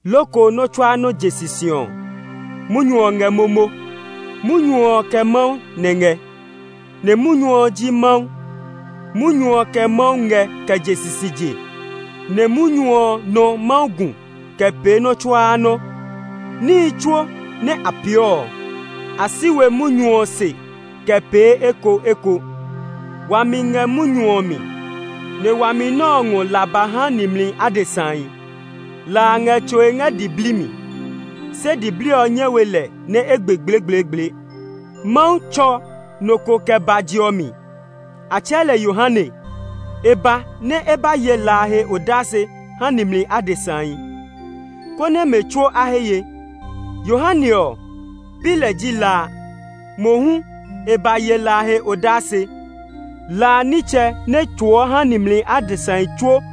Loko nɔ́ tsuaa nɔ́ je sisi ɔ, Munyu ɔ ngɛ momo. Munyu ɔ kɛ Mawu nɛ ngɛ, nɛ Munyu ji ɔ Mawu ngɛ. Munyu ɔ kɛ Mawu kɛ je sisije, nɛ Munyu ɔ nɔ Mawu gu kɛ pee nɔ́ tsuaa nɔ́. Níhi tsuo nɛ a pee ɔ, a si we Munyu ɔ se kɛ pee ekoeko. Wami ngɛ Munyu ɔ mi, nɛ wami nɛ ɔ ngɔ la ba ha nimli adesahi. La a ngɛ tsoe ngɛ diblii mi, se diblii ɔ nyɛ we lɛ nɛ e gbe gblegbleegble. Mawu tsɔ nɔ ko kɛ ba je ɔ mi. A tsɛɛ lɛ Yohane. E ba nɛ e ba ye la a he odase ha nimli adesahi, konɛ mɛ tsuo a he ye. Yohane ɔ, pi lɛ ji la a; mohu e ba ye la a he odase. La nɛ ɔ ji la nɛ tsoɔ haa nimli adesahi tsuo.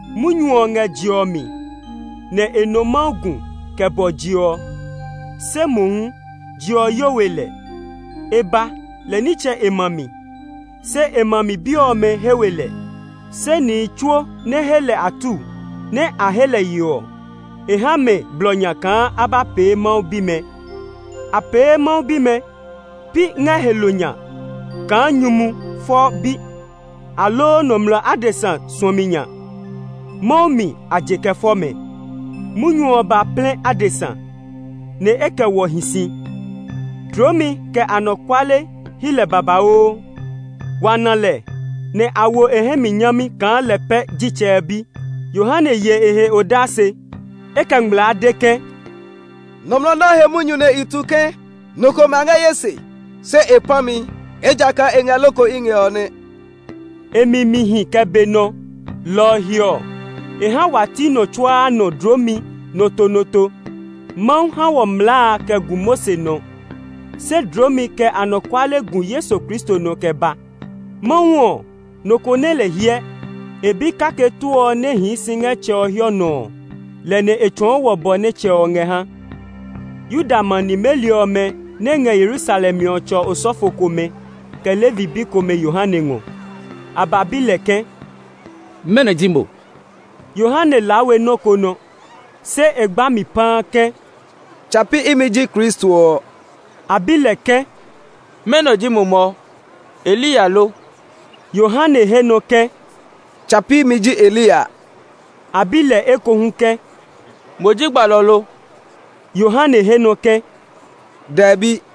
Munyu ɔ ngɛ je ɔ mi, nɛ e nɔ Mawu gu kɛ bɔ je ɔ, se mohu je ɔ yo we lɛ. E ba lɛ nitsɛ e ma mi, se e ma mi bi ɔmɛ he we lɛ. Se nihi tsuo nɛ he lɛ atuu, nɛ a he lɛ ye ɔ, e ha mɛ blɔ nya kaa a ba pee Mawu bimɛ. A pee mɛ Mawu bimɛ, pi ngɛ he lo nya kaa nyumu fɔɔ bi aloo nɔmlɔ adesa suɔmi nya; Mawu mi a je kɛ fɔ mɛ. Munyu ɔ ba plɛ adesa, nɛ e kɛ wɔ hi si. Dloomi kɛ anɔkuale hyi lɛ babauu. Wa na lɛ, nɛ a wo e hɛ mi nyami kaa lɛ pɛ ji Tsɛ ɔ Bi. Yohane ye e he odase. E kɛ ngmlaa de ke, “Nɔmlɔ nɛ ɔ he munyu nɛ i tu ke, ‘Nɔ ko ma ngɛ ye se; se e pã mi, ejakaa e ngɛ loko i ngɛ’ ɔ nɛ.” E mi mi hi kɛ be nɔ, lɔ ɔ he ɔ, e ha wa ti nɔ tsuaa nɔ dloomi nɔtonɔto. Mawu ha wɔ mlaa kɛ gu Mose nɔ, se dloomi kɛ anɔkuale gu Yesu Kristo nɔ kɛ ba. Mawu ɔ, nɔ ko nɛ lɛ hyɛ. E bi kake too ɔ nɛ hii si ngɛ Tsɛ ɔ hiɔ nɔ ɔ, lɛ nɛ e tsɔɔ wɔ bɔ nɛ Tsɛ ɔ ngɛ ha. Yuda ma nimeli ɔmɛ nɛ ngɛ Yerusalem ɔ tsɔ osɔfo komɛ, kɛ Levi bi komɛ Yohane ngɔ. A ba bi lɛ ke, “Mɛnɔ ji mo?” Yohane laa we nɔ́ ko nɔ, se e gba mi paa ke, “Tsa pi imi ji Kristo ɔ.” A bi lɛ ke, “Mɛnɔ ji mo mɔ? Eliya lo?” Yohane he nɔ ke, “Tsa pi imi ji Eliya.” A bi lɛ ekohu ke, “Mo ji gbalɔ ɔ lo?” Yohane he nɔ ke, “Dɛbi!”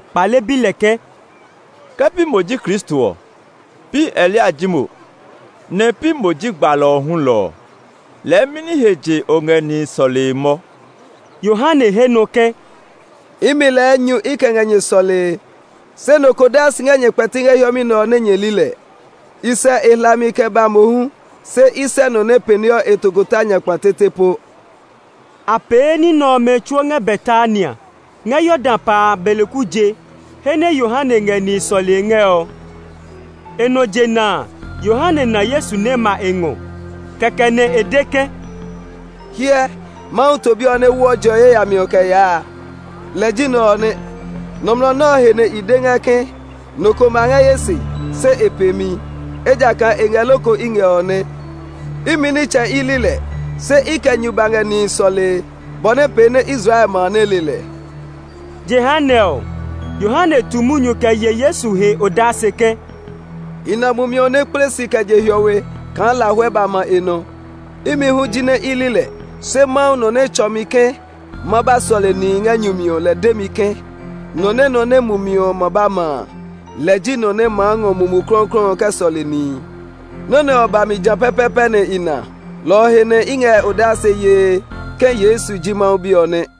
kpale bi lɛ ke, “Ke pi mo ji Kristo ɔ, pi Eliya ji mo, nɛ pi mo ji gbalɔ ɔ hulɔ ɔ, lɛɛ mɛni he nɛ o ngɛ nihi sɔlee mɔ?” Yohane he nɔ ke, “Imi lɛɛ nyu i kɛ ngɛ nyɛ sɔlee; se nɔ ko daa si ngɛ nyɛ kpɛti ngɛ hiɛmɛ nɛ ɔ nɛ nyɛ li lɛ. I sɛ e hlami kɛ ba mohu, se i sɛ nɔ nɛ pɛneɔ e tokota nya kpa tete po.” A pee ní nɛ ɔmɛ tsuo ngɛ Betania, ngɛ Yordan pa a beleku je, he nɛ Yohane ngɛ nihi sɔlee ngɛ ɔ. E nɔ jena a, Yohane na Yesu nɛ ma e ngɔ. Kɛkɛ nɛ e de ke, “Hyɛ, Mawu To Bi ɔ nɛ woɔ je ɔ he yayami kɛ yaa a, lɛ ji nɛ ɔ nɛ. Nɔmlɔ nɛ ɔ he nɛ i de ngɛ ke, ‘Nɔ ko ma ngɛ ye se, se e pe mi, ejakaa e ngɛ loko i ngɛ’ ɔ nɛ. Imi nitsɛ i li lɛ, se i kɛ nyu ba ngɛ nihi sɔlee, bɔ nɛ pee nɛ Israel ma a nɛ le lɛ.” Jehanɛ ɔ, Yohane tu munyu kɛ ye Yesu he odase ke, “I na Mumi ɔ nɛ kple si kɛ je hiɔwe kaa lahuɛ ba ma e nɔ. Imi hu jinɛ i li lɛ, se Mawu, nɔ nɛ tsɔ mi ke ma ba sɔle nihi ngɛ nyu mi ɔ lɛ de mi ke, ‘Nɔ nɛ nɔ nɛ Mumi ɔ ma ba ma a, lɛ ji nɔ nɛ maa ngɔ Mumi Klɔuklɔu ɔ kɛ sɔle nihi.’ Nɔ́ nɛ ɔ ba mi jã pɛpɛɛpɛ nɛ i na, lɔ ɔ he nɛ i ngɛ odase yee ke Yesu ji Mawu Bi ɔ nɛ.”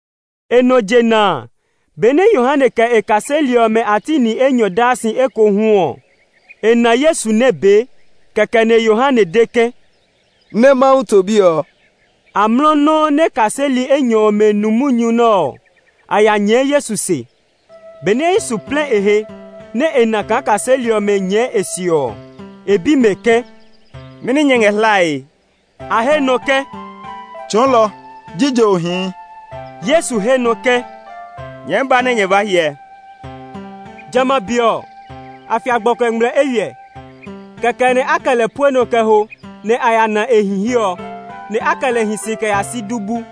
E nɔ jena benɛ Yohane kɛ e kaseli ɔmɛ a ti ni enyɔ daa si ekohu ɔ, e na Yesu nɛ bee. Kɛkɛ nɛ Yohane de ke, “Ne Mawu To Bi ɔ!” Amlɔ nɔuu nɛ kaseli enyɔ ɔmɛ nu munyu nɛ ɔ, a ya nyɛɛ Yesu se kɛ yaa. Benɛ Yesu plɛ e he, nɛ e na kaa kaseli ɔmɛ nyɛɛ e se ɔ, e bi mɛ ke, “Mɛni nyɛ ngɛ hlae?” A he nɔ ke, “Tsɔɔlɔ, jije o hii?” Yesu he nɔ ke, “Nyɛɛ ba nɛ nyɛ ba hyɛ.” (Jamɛ a be ɔ, a fia gbɔkuɛ ngmlɛ eywiɛ). Kɛkɛ nɛ a kɛ lɛ pue nɔ kɛ ho, nɛ a ya na e hi he ɔ; nɛ a kɛ lɛ hi si kɛ ya si du bu.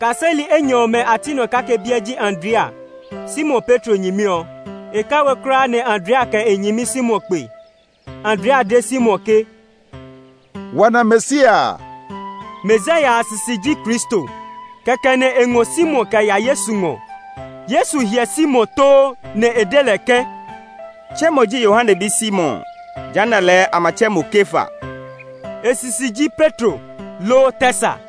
Kaseli enyɔ ɔmɛ a ti nɔ kake biɛ ji Andrea, Simon Petro nyɛmi ɔ. E kɛ we kulaa nɛ Andrea kɛ e nyɛmi Simon ba kpe. Andrea de Simon ke, “Wa na Mesia a.” (Mesia sisi ji Kristo). Kɛkɛ nɛ e ngɔ Simon kɛ ya Yesu ngɔ. Yesu hyɛ Simon too, nɛ e de lɛ ke, “Tse mo ji Yohane bi Simon ɔ. Jehanɛ lɛɛ a ma tsɛ mo Kefa.” (E sisi ji Petro, loo tɛ sa.)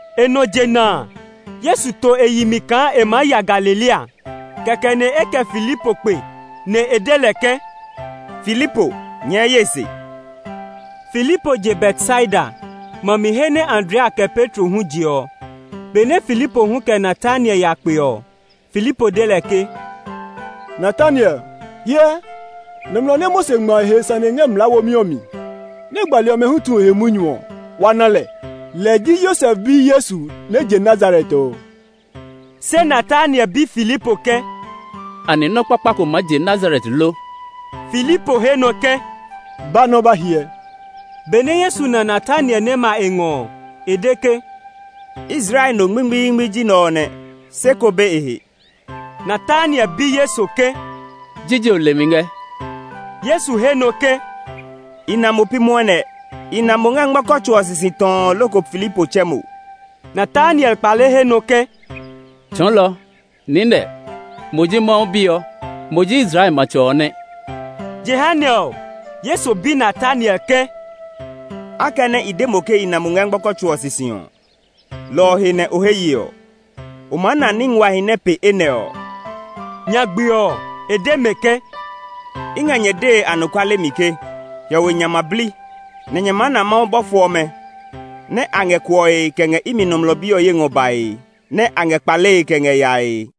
E nɔ jena a, Yesu to e yi mi kaa e maa ya Galilea. Kɛkɛ nɛ e kɛ Filipo kpe, nɛ e de lɛ ke, “Filipo, nyɛɛ ye se.” Filipo je Betsaida, ma mi he nɛ Andrea kɛ Petro hu je ɔ. Benɛ Filipo hu kɛ Natanael ya kpe ɔ, Filipo de lɛ ke, “Natanael, hyɛ, nɔmlɔ ɔ nɛ Mose ngma e he sane ngɛ mlaa womi ɔ mi, nɛ gbali ɔmɛ hu tu e he munyu ɔ, wa na lɛ. Lɛ ji Yosef bi Yesu nɛ je Nazaret ɔ.” Se Natanael bi Filipo ke, “Anɛ nɔ́ kpakpa ko maa je Nazaret lo?” Filipo he nɔ ke, “Ba nɛ o ba hyɛ!” Benɛ Yesu na Natanael nɛ ma e ngɔ ɔ, e de ke, “Israel no ngmingmiingmi ji nɛ ɔ nɛ; sé ko be e he.” Natanael bi Yesu ke, “Jije o le mi ngɛ?” Yesu he nɔ ke, “I na mo pi mwɔnɛ; i na mo ngɛ ngmɔkɔ tso ɔ sisi tɔɔ loko Filipo tsɛ mo.” Natanael kpale he nɔ ke, “Tsɔɔlɔ, niinɛ, mo ji Mawu Bi ɔ! Mo ji Israel matsɛ ɔ nɛ!” Jehanɛ ɔ, Yesu bi Natanael ke, “Akɛnɛ i de mo ke i na mo ngɛ ngmɔkɔ tso ɔ sisi ɔ, lɔ ɔ he nɛ o he ye ɔ? O maa na ní nguahi nɛ pe enɛ ɔ.” Nyagbe ɔ, e de mɛ ke, “I ngɛ nyɛ dee anɔkuale mi ke hiɔwe nya ma bli, nɛ nyɛ maa na Mawu bɔfo ɔmɛ nɛ a ngɛ kuɔe kɛ ngɛ imi Nɔmlɔ Bi ɔ ye ngɔ bae, nɛ a ngɛ kpalee kɛ ngɛ yae.”